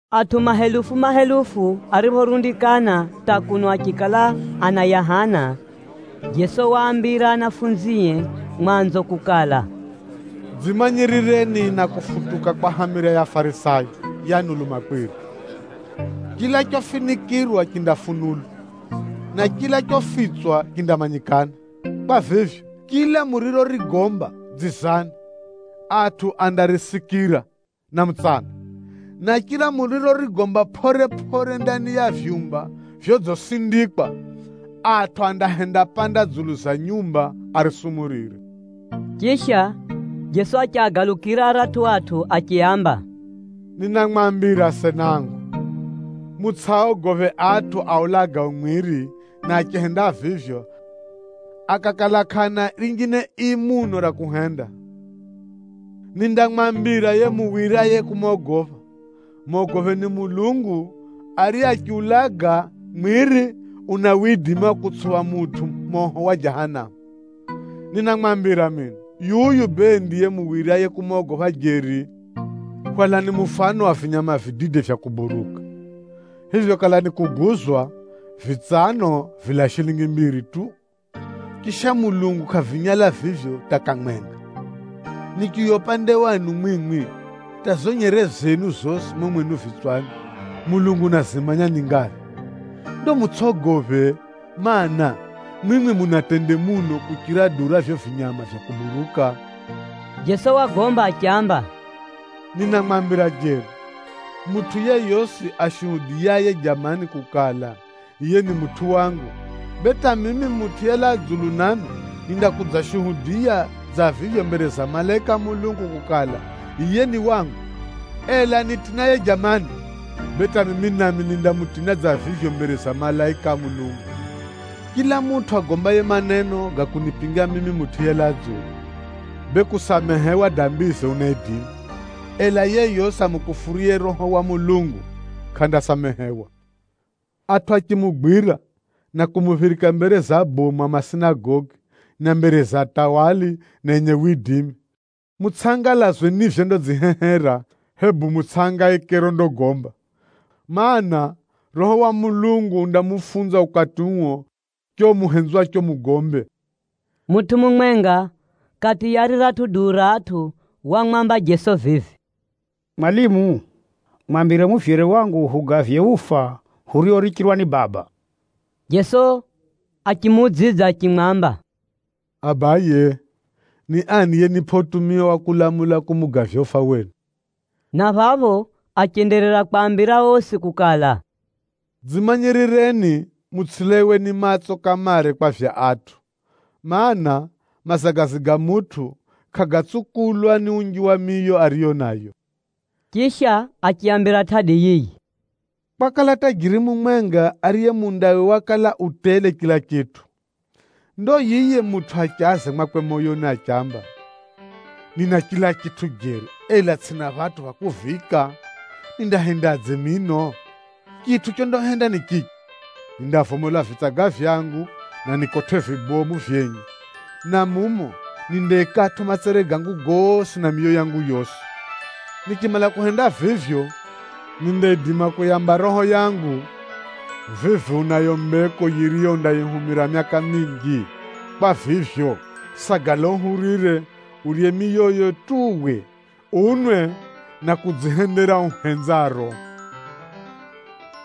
Atʼu mahelufu na mahelufu ariphorundikana hata kuno achikala anayahana, Jeso waambira anafunzie mwanzo kukala, “Dzimanyirireni na kufutuka kwa hamira ya Afarisayo, yani ulumakwiri. Chila chofinikʼirwa chindafunulwa, na chila chofitswa chindamanyikana. Kwa vivyo, chila murirorigomba dzizani, atʼu andarisikira na mutsana, na chila murirorigomba pʼore-pʼore ndani ya vyumba vyodzisindikwa, atʼu andahendapanda dzulu ya nyumba arisumurire.” Chisha, Jeso achiagalukira aratʼu atʼu achiaamba, “Ninamwambira asena angu, mutsʼiaogophe atʼu aulagao mwiri na achihenda vivyo akakala kʼaana rinjine ii muno ra kuhenda. Nindamwambira yiye muwiryaye kumogopha: mogopheni Mulungu, ariye achiulaga mwiri, una widimi wa kutsupha mutʼu moho wa Jahanamu. Ninamwambira mino, yuyu bee ndiye muwiryaye kumogopha jeri! “Hwalani mufano wa vinyama vidide vya kuburuka. Vivyo kala nikuguzwa, vitsano vilaa shilingi mbiri tu, chisha Mulungu kʼavinyala vivyo hata kamwenga. Nichiuya upande wenu mwimwi, hata zo nyere zenu zosi mumo mwenu vitswani, Mulungu unazimanya ni nyingaphi! Ndo mutsʼogophe, mana, mwimwi muna tende muno kuchira duu ra vivyo vinyama vya kuburuka!” Jeso wagomba achiamba, “Ninamwambira jeri, mutʼu yeyosi ashuhudiyaye jamani kukala, yiye ni mutʼu wangu, bee hata mimi Mutʼu yelaa dzulu nami nindakudzashuhudiya dza vivyo mbere za malaika a Mulungu kukala, yiye ni wangu. Ela anitinaye jamani, bee hata mimi nami nindamutina dza vivyo mbere za malaika a Mulungu. “Chila mutʼu agombaye maneno ga kunipinga mimi Mutʼu yelaa dzulu, bee kusamehewa dambize unaidima, ela yeyosi amukufuruye Roho wa Mulungu kʼandasamehewa. “Atʼu achimugwira na kumuphirika mbere za abomu a masinagogi na mbere za atawali na enye widimi, mutsʼangalazwe ni vyondadzihehera hebu mutsʼitangetange rondagomba. Maana, Roho wa Mulungu undamufunza ukati uo chicho muhenzwacho mugombe.” Mutʼu mumwenga kati ya riratʼu duu ra atʼu wamwamba Jeso vivi, “Mwalimu, mwambire muvyere wangu hugavye ufa huriorichirwa ni baba.” Jeso achimuudzidza achimwamba, “Abaye, ni ani yenipʼa utumia wa kulamula kumugavya ufa wenu?” Na phapho achenderera kwaambira osi kukala, “Dzimanyirireni mutsʼilaiwe ni matso kamare kwa vya atʼu, mana, mazagazi ga mutʼu kʼagatsukulwa ni unji wa miyo ariyo nayo.” Chisha achiaambira tʼadi yiyi, “Kwakala dzumbe mumwenga ariye mundawe wakala udziudzala chila chitʼu. Ndo yiye mutʼu achaza mwakwe moyoni achiamba, ‘Nina chila chitʼu jeri, ela tsʼina phatʼu pha kuviika, nindahendadze mino? Chitʼu chondahenda ni chichi, nindavomola vitsaga vyangu na nikotʼe vibomu vyenye, na mumo nindaikatʼo matsere gangu gosi na miyo yangu yosi. Nichimala kuhenda vivyo, nindaidima kuyamba roho yangu, vivi unayo mbeko yiriyo undahumira myaka minji. Kwa vivyo, sagala uhurire, urye miyo tu uwe, unwe na kudzihendera uhenzaro.’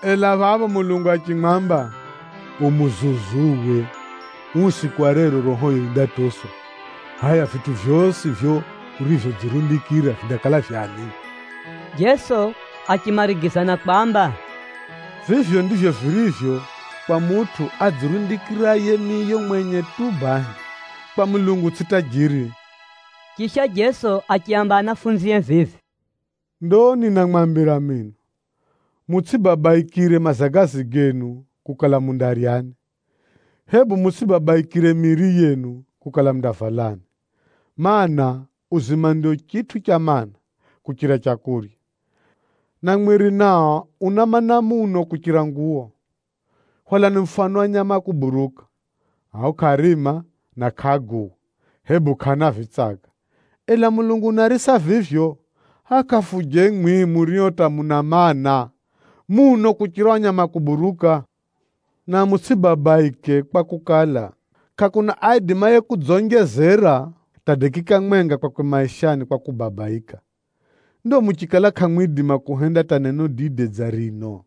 Ela phapho Mulungu achimwamba, ‘U muzuzu uwe. Uu usiku wa rero rohoyo yindatoswa. Hʼaya, vitʼu vyosi vivyo urivyodzirundikira vindakala vya ani?’” Jeso achimarigiza na kwamba, “Vivyo ndivyo virivyo kwa mutʼu adzirundikiraye miyo mwenye tu bahi, kwa Mulungu tsʼiye tajiri.” Chisha Jeso achiaamba anafunzie vivi, “Ndo ninamwambira mino, mutsʼibabaikire mazagazi genu, kukala mundaryani, hebu mutsʼibabaikire miiri yenu, kukala mundavalani. Maana, uzima ndio chitʼu cha mana, kuchira leu, na mwiri nao una maana, muno kuchira nguwo. Hwalani mufano wa nyama a kuburuka. Ao kʼaarima na kʼaaguwa, hebu kʼaana vitsaga, ela Mulungu unaarisa vivyo. Hʼaya kafuje mwimwi murio hata muna maana muno kuchira ao nyama a kuburuka? Na mutsʼibabaike kwakukala, kʼakuna aidimaye kudzonjezera hata dakika mwenga kwakwe maishani kwa kubabaika. Ndo muchikala kʼamwidima kuhenda hata neno dide dza rino,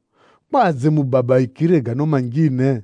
kwadze mubabaikire gano manjine?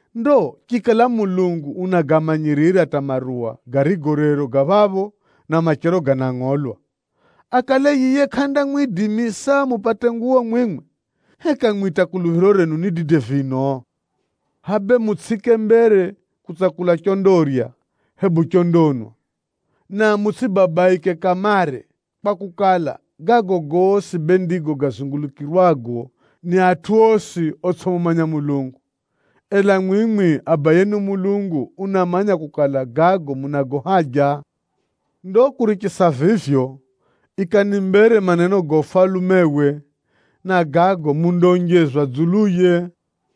Ndo chikala Mulungu unagamanyirira hata maruwa, garigo rero ga phapho na machero ganangʼolwa, akale yiye kʼandamwidimisa mupate nguwo mwimwi? Heka mwimwi hata kuluphiro renu ni dide vino? Hʼaya bee mutsʼiike mbere kutsakula chondarya hebu chondanwa, na mutsʼibabaike kamare. Kwakukala, gago gosi bee ndigo gazungulukirwago ni atʼu osi otsʼimumanya Mulungu. Ela mwimwi Abayenu Mulungu unamanya kukala, munago haja gago. Ndo kurichisa vivyo, ikani mbere maneno ga Ufalumewe, na gago mundaonjezwa dzuluye.”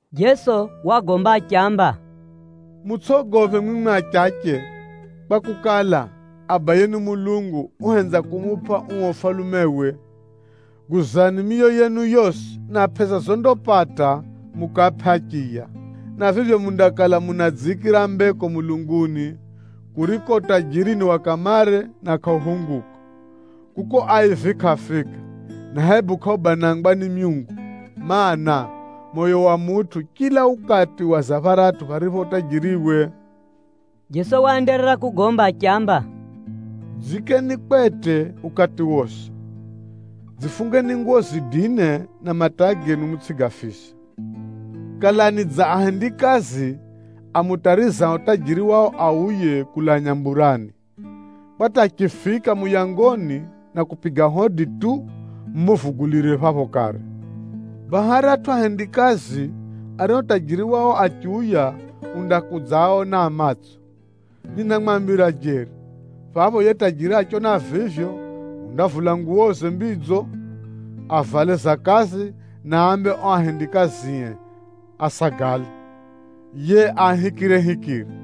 Jeso wagomba achiamba, “Mutsʼogophe mwimwi achache, kwakukala, Abayenu Mulungu uhenza kumupʼa uo ufalumewe. Guzani miyo yenu yosi na pʼesa zondapata mukaapʼe achiya, na vivyo mundakala munadziikira mbeko mulunguni, kuriko utajiri ni wa kamare na kʼauphunguka. Kuko aivi kʼaafika, na hebu kʼaubanangwa ni myungu. Maana, moyo wa mutʼu chila ukati waza pharatʼu pharipho utajiriwe.” Jeso waenderera kugomba achiamba, “Dziikeni kwete ukati wosi, dzifungeni nguwo zidine na mataa genu mutsʼigafise. Kalani dza ahendikazi amutarizao tajiri wao auye kulaa nyamburani, kwa hata achifika muyangoni na kupiga hodi tu, mumuvugulire phapho kare. Baha aratʼu ahendikazi ario tajiri wao achiuya undakudzaaona a matso. Ninamwambira jeri, phapho yiye tajiri achiona vivyo undavula nguwoze mbidzo, avale za kazi na ambe ao ahendikazie asagale, yiye aahikirehikire.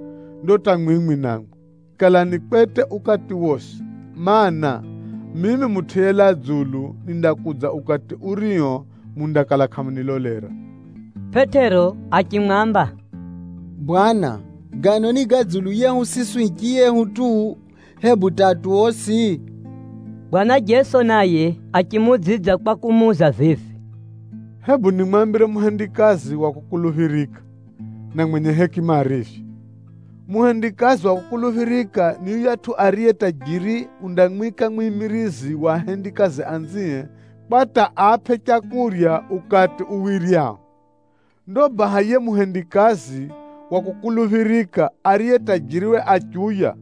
Ndo hata mwimwi namwi, kalani kwete ukati wosi, mana, mimi Mutʼu yelaa dzulu nindakudza ukati urio mundakala kʼamunilolera.” Pʼetero achimwamba, “Bwana, gano ni ga dzulu yehu siswi hichiyehu tu, hebu hata atʼu osi?” Bwana Jeso naye achimuudzidza kwa kumuuza vivi, “Hebu nimwambire muhendikazi wa kukuluphirika, na mwenye hekima arivyo. Muhendikazi wa kukuluphirika ni yuyatʼu ariye tajiri undamwika mwimirizi wa ahendikazi anzie kwa hata aapʼe leu ukati uwiryao. Ndo baha yiye muhendikazi wa kukuluphirika ariye tajiriwe achiuya,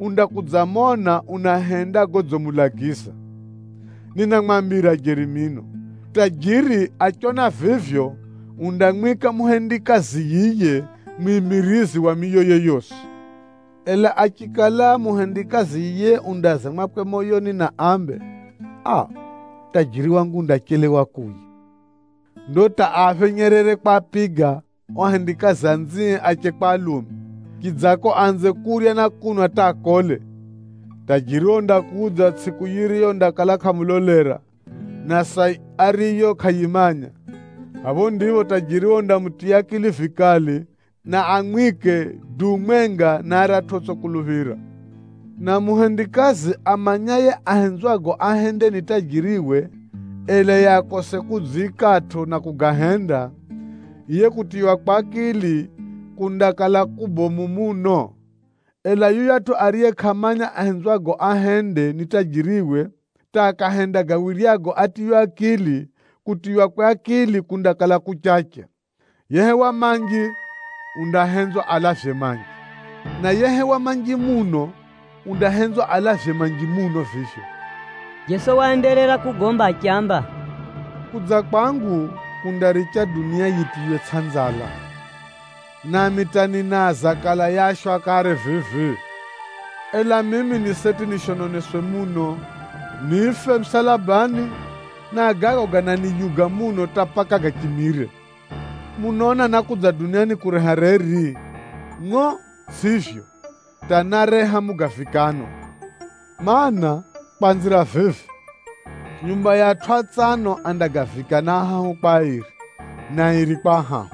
undakudzamona unahenda godzimulagiza. Ninamwambira jeri mino, tajiri achiona vivyo, undamwika muhendikazi yiye mwimirizi wa miyoye yosi. Ela achikala muhendikazi yiye undaaza mwakwe moyoni ambe, ‘Aa, tajiri wangu undachelewa kuuya,’ ndo hata aaphenyerere kwapiga ao ahendikazi anzie ache kwa alume, chidzako aanze kurya na kunwa hata akole, tajiriwe nikudza tsʼiku yiriyo undakala kʼamulolera, na saa ariyo kʼayimanya. Phapho ndipho tajiriwe undamutiya akili vikali, na amwike duu mwenga na aratʼu otsʼikuluphira. Na muhendikazi amanyaye ahenzwago ahende ni tajiriwe ela yiye akose kudziikatʼo na kugahenda, yiye kutiywakwe akili kundakala kubomu muno. Ela yuyatʼu ariye kʼamanya ahenzwago ahende ni tajiriwe, hata akahenda gawiryago atiywe akili, kutiywakwe akili kundakala kuchache. Yehewa manji undahenzwa alavye manji, na yehewa manji muno undahenzwa alavye manji muno vivyo.” Jeso waenderera kugomba achiamba, “Kudza kwangu kundaricha dunia yitiywe tsʼanzala, nami hata ninaaza kala yaashwa kare vivi. Ela mimi ni seti nishononeswe muno, nife musalabani, na gago gananiyuga muno hata paka gachimire! Munaona nákudza duniani kureha reri? Ngʼo tsʼivyo, hata náreha mugavikano. Maana, kwanzira vivi, nyumba ya atʼu atsano andagavikana ahahu kwa airi, na airi kwa ahahu.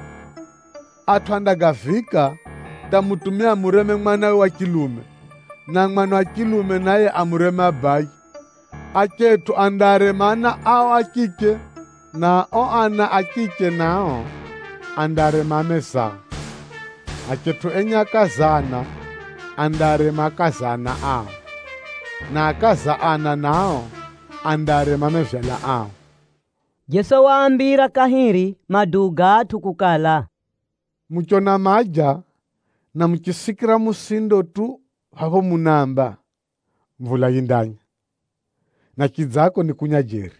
Atʼu andagavika, hata mutumia amureme mwanawe wa chilume, na mwana wa chilume naye amureme abaye. Achetʼu andaarema ana ao a chiche, na ao ana a chiche nao, andaarema amezao. Achetʼu enye akaza ana andaarema akaza ana ao, na akaza ana nao, andaarema mevyala ao.” Jeso waambira kahiri maduu ga atʼu kukala, “Muchona maja, na muchisikira musindo tu phapho munaamba, ‘Mvula yindanya,’ na chidzako nikunya jeri.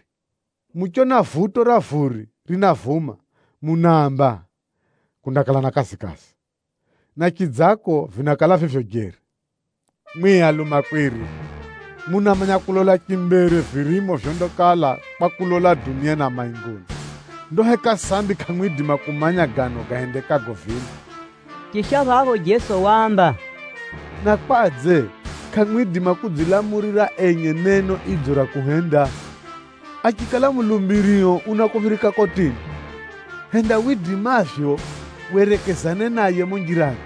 Muchona vuto ra vuri rinavuma munaamba, ‘Kundakala na kazikazi,’ na chidzako vinakala vivyo jeri. Mwimwi alumakwiri, munamanya kulola chimbere virimo vyondakala kwa kulola duniani na mainguni, ndo heka sambi kʼamwidima kumanya gano gahendekago vino?” Chisha phapho Jeso waamba, “Na kwadze kʼamwidima kudzilamulira enye neno idzo ra kuhenda? Achikala mulumbirio unakuphirika kotini, henda widimavyo werekezane naye mumo njirani,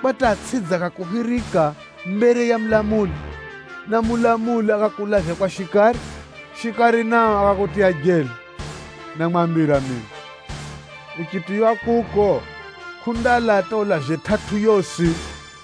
kwa hata atsʼidze akakuphirika mbere ya mulamuli, na mulamuli akakulavya kwa shikari, shikari naye akakutiya jela. Ninamwambira mino, uchitiywa kuko, kʼundalaa hata ulavye tʼatʼu yosi.”